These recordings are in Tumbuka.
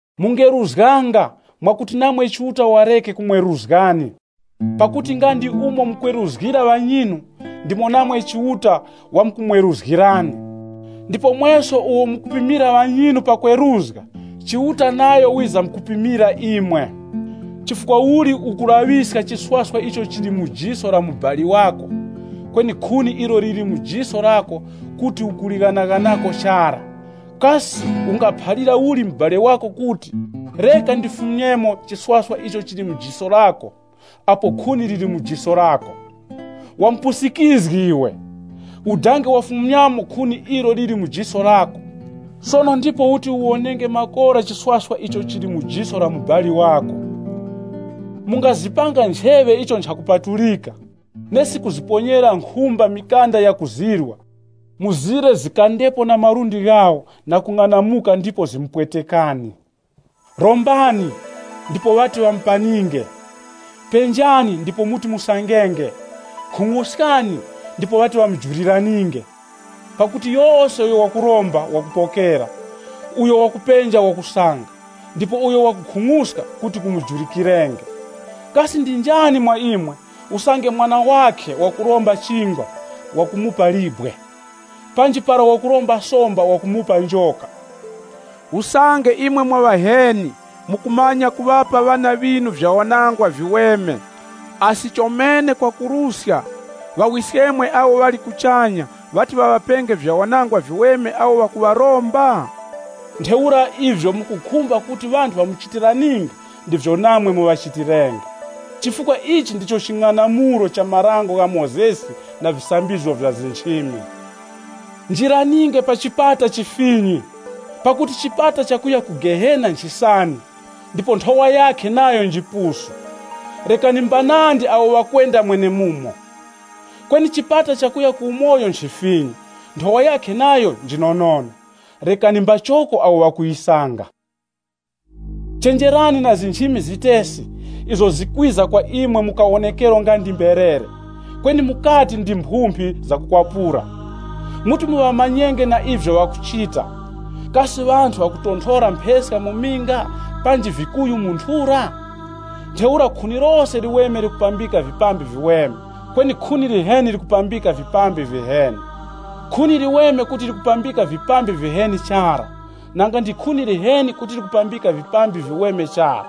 “Mungeruzganga, mwakuti namwe Chiuta wareke kumweruzgani Pakuti nga ndi umo mukweruzgira ŵanyinu, ndimo namwe Chiuta wamkumweruzgirani. Ndipo mweso uwo mukupimira ŵanyinu pakweruzga, Chiuta nayo wizamkupimira imwe. Chifukwa uli ukulaŵiska chiswaswa icho chili mu jiso la mubali wako, kweni khuni ilo liri mu jiso lako kuti ukulighanaghanako chara? Kasi ungaphalira uli mubali wako kuti, ‘Reka ndifumyemo chiswaswa icho chili mu jiso lako’ apo khuni liri mu jiso lako? Wamupusikizgi iwe, udange wafumyamo khuni ilo liri mu jiso lako, sono ndipo uti uwonenge makora chiswaswa icho chili mu jiso la mubali wako. “Mungazipanga ncheŵe icho nchakupatulika, nesi kuziponyera nkhumba mikanda yakuzirwa, mzire zikandepo na malundi ghawo na kung'anamuka ndipo zimupwetekani. “Rombani, ndipo ŵati ŵamupaninge. Penjani ndipo muti musangenge. Khung'uskani, ndipo ŵati ŵamujuliraninge. Pakuti yose uyo wakuromba, wakupokera, uyo wakupenja wakusanga, ndipo uyo wakukhung'uska, kuti kumujulikirenge. Kasi ndi njani mwa imwe, usange mwana wakhe wakuromba chingwa, wakumupa libwe? Panji para wakuromba somba, wakumupa njoka? Usange imwe mwa ŵaheni, mukumanya kuŵapa ŵana ŵinu vyawanangwa viweme, asi chomene kwakuruska Ŵawiskemwe awo ŵali kuchanya ŵati ŵaŵapenge vyawanangwa viweme awo ŵakuŵaromba? “Ntheura ivyo mukukhumba kuti ŵanthu ŵamuchitiraninge, ndivyo namwe muŵachitirenge. Chifukwa ichi ndicho ching'anamulo cha Dango la Mozesi na visambizgo vya nchimi. “Njiraninge pa chipata chifinyi. Pakuti chipata chakuya ku Gehena nchisani, ndipo nthowa yakhe nayo njipusu, rekani mbanandi awo ŵakwenda mwenemumo. Kweni chipata chakuya ku umoyo nchifinyi, nthowa yakhe nayo njinonono, rekani mbachoko awo ŵakuyisanga. “Chenjerani na nchimi zitesi, izo zikwiza kwa imwe mu kawonekero nga ndi mberere, kweni mukati ndi mphumphi zakukwapura. Muti muŵamanyenge na ivyo ŵakuchita. Kasi ŵanthu ŵakuponthora mpheska mu minga, panji vikuyu mu nthura? Ntheura khuni lose liweme likupambika vipambi viweme, kweni khuni liheni likupambika vipambi viheni. Khuni liweme kuti likupambika vipambi viheni chara, nanga ndi khuni liheni kuti likupambika vipambi viweme chara.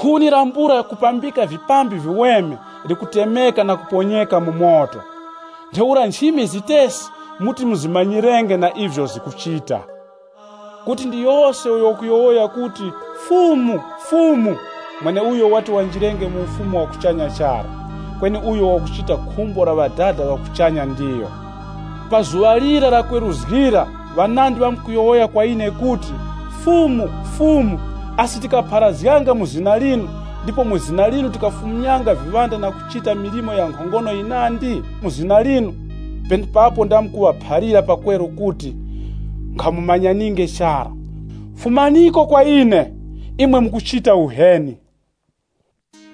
Khuni lambula kupambika vipambi viweme likutemeka na kuponyeka mu moto. Ntheura nchimi zitesi, muti muzimanyirenge na ivyo zikuchita. “Kuti ndi yose uyo wakuti, ‘Fumu, Fumu’ mweneuyo wati wanjirenge mu Ufumu wa kuchanya chara, kweni uyo wakuchita khumbo la Ŵadada ŵa kuchanya ndiyo. Pa zuŵa lira lakweruzga ŵanandi ŵamkuyowoya kwa ine kuti, ‘Fumu, Fumu, asi tikapharazganga mu zina linu, ndipo mu zina linu tikafumyanga viŵanda na kuchita milimo ya nkhongono yinandi mu zina linu?’ Penepapo ndamkuŵaphalira pakweru kuti, ‘Nkhamumanyaninge chara. Fumaniko kwa ine, imwe mukuchita uheni.’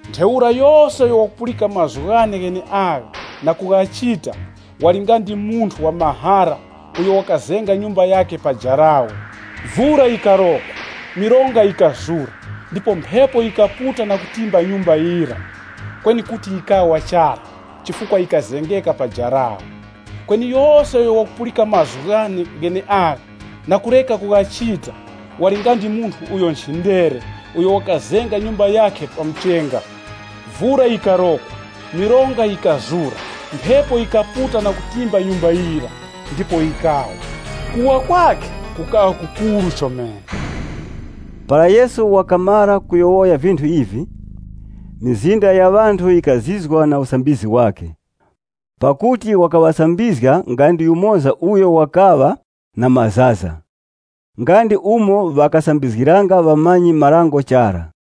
“Ntheura yose uyo wakupulika mazgu ghane gheneagha na kughachita, wali nga ndi munthu wa mahara uyo wakazenga nyumba yakhe pa jarawe. Vura yikarokwa, mironga yikazura, ndipo mphepo yikaputa na kutimba nyumba yira. Kweni kuti yikawa chara, chifukwa yikazengeka pa jarawe. “Kweni yose uyo wakupulika mazgu ghane gheneagha na kureka kughachita, wali nga ndi munthu uyo nchindere uyo wakazenga nyumba yakhe pa muchenga. Vura yikarokwa, mironga yikazura, mphepo yikaputa na kutimba nyumba yira, ndipo yikawa. Kuwa kwakhe kukaŵa kukuru chomene.” Para Yesu wakamara kuyowoya vinthu ivi, mizinda ya ŵanthu yikazizwa na usambizgi wakhe. Pakuti ŵakaŵasambizga nga ndi yumoza uyo wakaŵa na mazaza, nga ndi umo ŵakasambizgiranga ŵamanyi-marango chara.